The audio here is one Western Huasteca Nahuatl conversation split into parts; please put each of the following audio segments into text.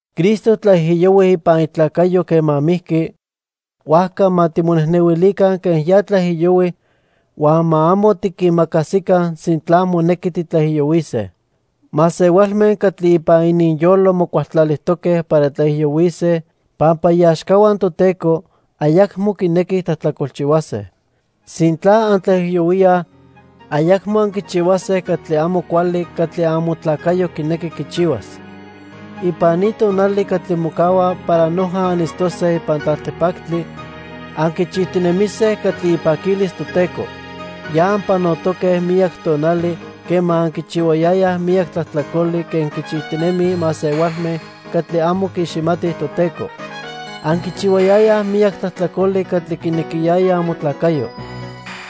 Cristo tlaijiyohui ipan itlacayo quema mijqui, huajca ma timonejnehuilica quen ya tlaijiyohui huan ma amo tiquimacasica sintla monequi titlaijiyohuise. Masehualme catli ipan ininyolo mocualtlalijtoque para tlaijiyohuise pampa iaxcahua Toteco ayacmo quinequij tlajtlacolchihuase. Sintla antlaijiyohuíaj, ayacmo anquichihuase catli amo cuali catli amotlacayo quinequi quichihuas. Ipan ni tonali catli mocahua para noja anitztose ipan tlaltipactli, anquichijtinemise catli ipaquilis Toteco. Ya anpanotoque miyac tonali quema anquichihuayayaj miyac tlajtlacoli quen quichijtinemij masehualme catli amo quiiximatij Toteco. Anquichihuayayaj miyac tlajtlacoli catli quinequiyaya amotlacayo.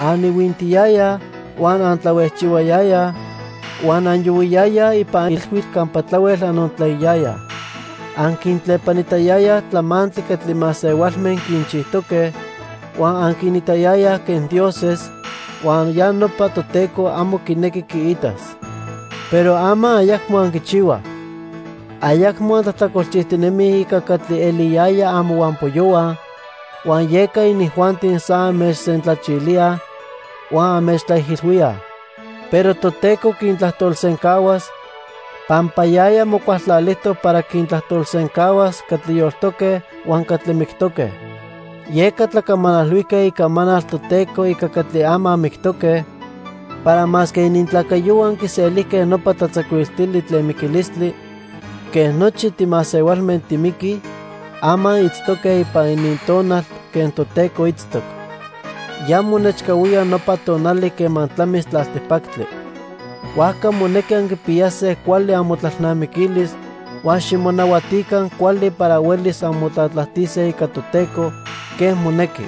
Anihuintiyayaj, huan antlahuejchihuayayaj, huan anyohuiyayaj ipan ilhuitl campa tlahuel anontlaiyayaj. Anquintlepanitayayaj tlamantli catli masehualme quinchijtoque, huan anquinitayayaj quen dioses, huan ya nopa Toteco amo quinequi quiitas. Pero ama ayacmo anquichihuaj. Ayacmo antlajtlacolchijtinemij ica catli eliyayaj amohuampoyohua, huan yeca inijuanti san anmechsentlachilíaj huan anmechtlaijilhuíaj. Pero Toteco quintlajtolsencahuas pampa yaya mocualtlalijtoc para quintlajtolsencahuas catli yoltoque huan catli mictoque. Yeca tlacamanalhuijque icamanal Toteco ica catli ama mictoque para masque inintlacayohua quiselijque nopa tlatzacuiltili tlen miquilistli quen nochi timasehualme timiquij, ama itztoque ipan inintonal quen Toteco itztoc. Ya monechcahuía nopa tonali quema tlamis tlaltipactli. Huajca monequi anquipiyase cuali amotlalnamiquilis huan ximonahuatica cuali para huelis anmotlatlajtise ica Toteco quen monequi.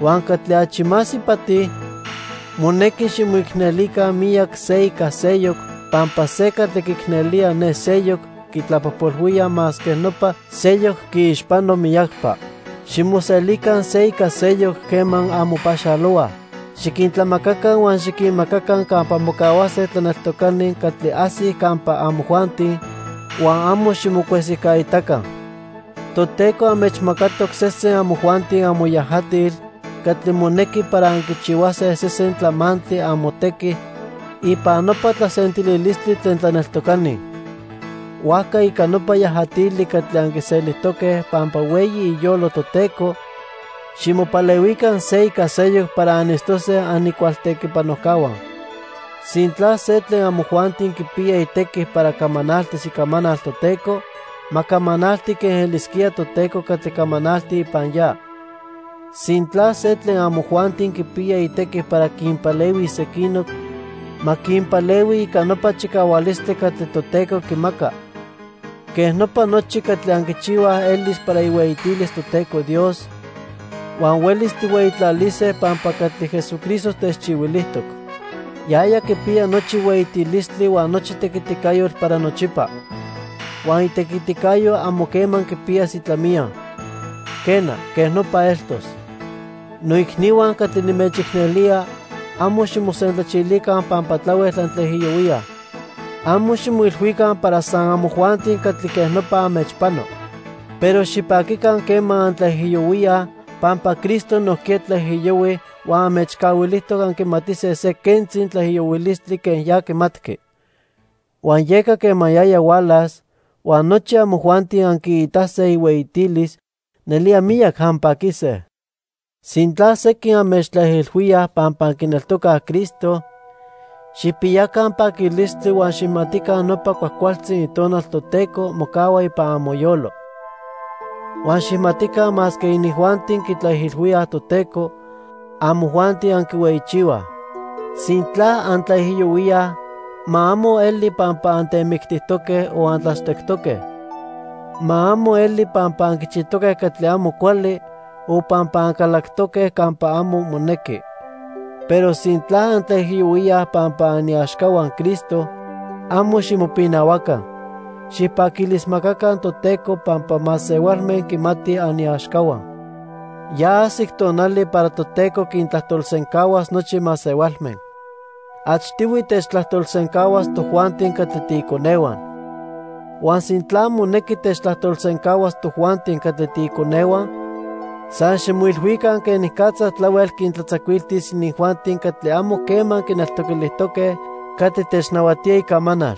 Huan catli achi más ipati, monequi ximoicnelica miyac se ica seyoc, pampa se catli quiicnelía ne seyoc quitlapojpolhuía masque nopa seyoc quiixpano miyacpa. Ximoselica se ica seyoc quema anmopaxalohuaj. Xiquintlamacaca huan xiquinmacaca campa mocahuase tlaneltocani catli ajsij campa amojuanti, huan amo ximocuesijcaitaca. Toteco anmechmacatoc sesen amojuanti amoyajatil catli monequi para anquichihuase sesen tlamantli amotequi ipan nopa tlasentililistli tlen tlaneltocani. Huajca ica nopa yajatili catli anquiselijtoque pampa hueyi iyolo Toteco, ximopalehuica se ica seyoc para anitztose anicualtequipanojcahua. Sintla se tlen amojuanti quipiya itequi para camanaltis icamanal Toteco, ma camanalti quen elisquía Toteco catli camanalti ipan ya. Sintla se tlen amojuanti quipiya itequi para quinpalehuis sequinoc, ma quinpalehui ica nopa chicahualistli catli Toteco quimaca. Quej nopa nochi catli anquichihuaj elis para ihueyitilis Toteco Dios, huan huelis tijhueyitlalise pampa catli Jesucristo techchihuilijtoc. Yaya quipiya nochi hueyitilistli huan nochi tequiticayotl para nochipa. Huan itequiticayo amo quema quipiyas itlamiya. Quena, quej nopa eltos. Noicnihua catli nimechicnelía, amo ximosentlachilica pampa tlahuel antlaijiyohuíaj. Amo ximoilhuica para san amojuanti catli quej nopa anmechpano. Pero xipaquica quema antlaijiyohuíaj pampa Cristo nojquiya tlaijiyohui huan anmechcahuilijtoc anquimatise se quentzi tlaijiyohuilistli quen ya quimatqui. Huan yeca quema yaya hualas huan nochi amojuanti anquiitase ihueyitilis, nelía miyac anpaquise. Sintla sequin anmechtlaijilhuíaj pampa anquineltocaj Cristo, xijpiyaca paquilistli huan xijmatica nopa cuajcualtzi Itonal Toteco mocahua ipan amoyolo. Huan xijmatica masque inijuanti quitlaijilhuíaj Toteco, amojuanti anquihueyichihuaj. Sintla antlaijiyohuíaj, ma amo eli pampa antemictijtoque o antlachtectoque. Ma amo eli pampa anquichijtoque catli amo cuali o pampa ancalactoque campa amo monequi. Pero sintla antlaijiyohuíaj pampa aniaxcahua Cristo, amo ximopinahuaca. Xijpaquilismacaca Toteco pampa masehualme quimatij aniaxcahua. Ya ajsic tonali para Toteco quintlajtolsencahuas nochi masehualme. Achtihui techtlajtolsencahuas tojuanti catli tiiconehua. Huan sintla monequi techtlajtolsencahuas tojuanti catli tiiconehua, san ximoilhuica quenicatza tlahuel quintlatzacuiltis inijuanti catli amo quema quineltoquilijtoque catli technahuatía icamanal.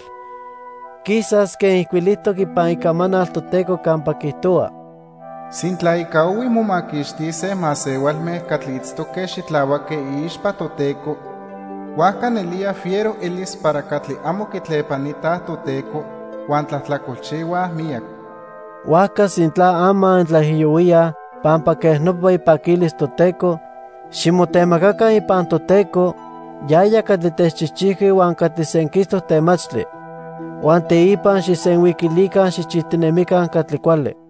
Quisas quen ijcuilijtoc ipan Icamanal Toteco campa quiijtohua: "Sintla ica ohui momaquixtise masehualme catli itztoque xitlahuaque iixpa Toteco, huajca nelía fiero elis para catli amo quitlepanitaj Toteco huan tlajtlacolchihuaj miyac." Huajca sintla ama antlaijiyohuíaj pampa quej nopa ipaquilis Toteco, ximotemacaca ipan Toteco, yaya catli techchijchijqui huan catli senquistoc temachtli. Huan teipa xijsenhuiquilica xijchijtinemica catli cuali.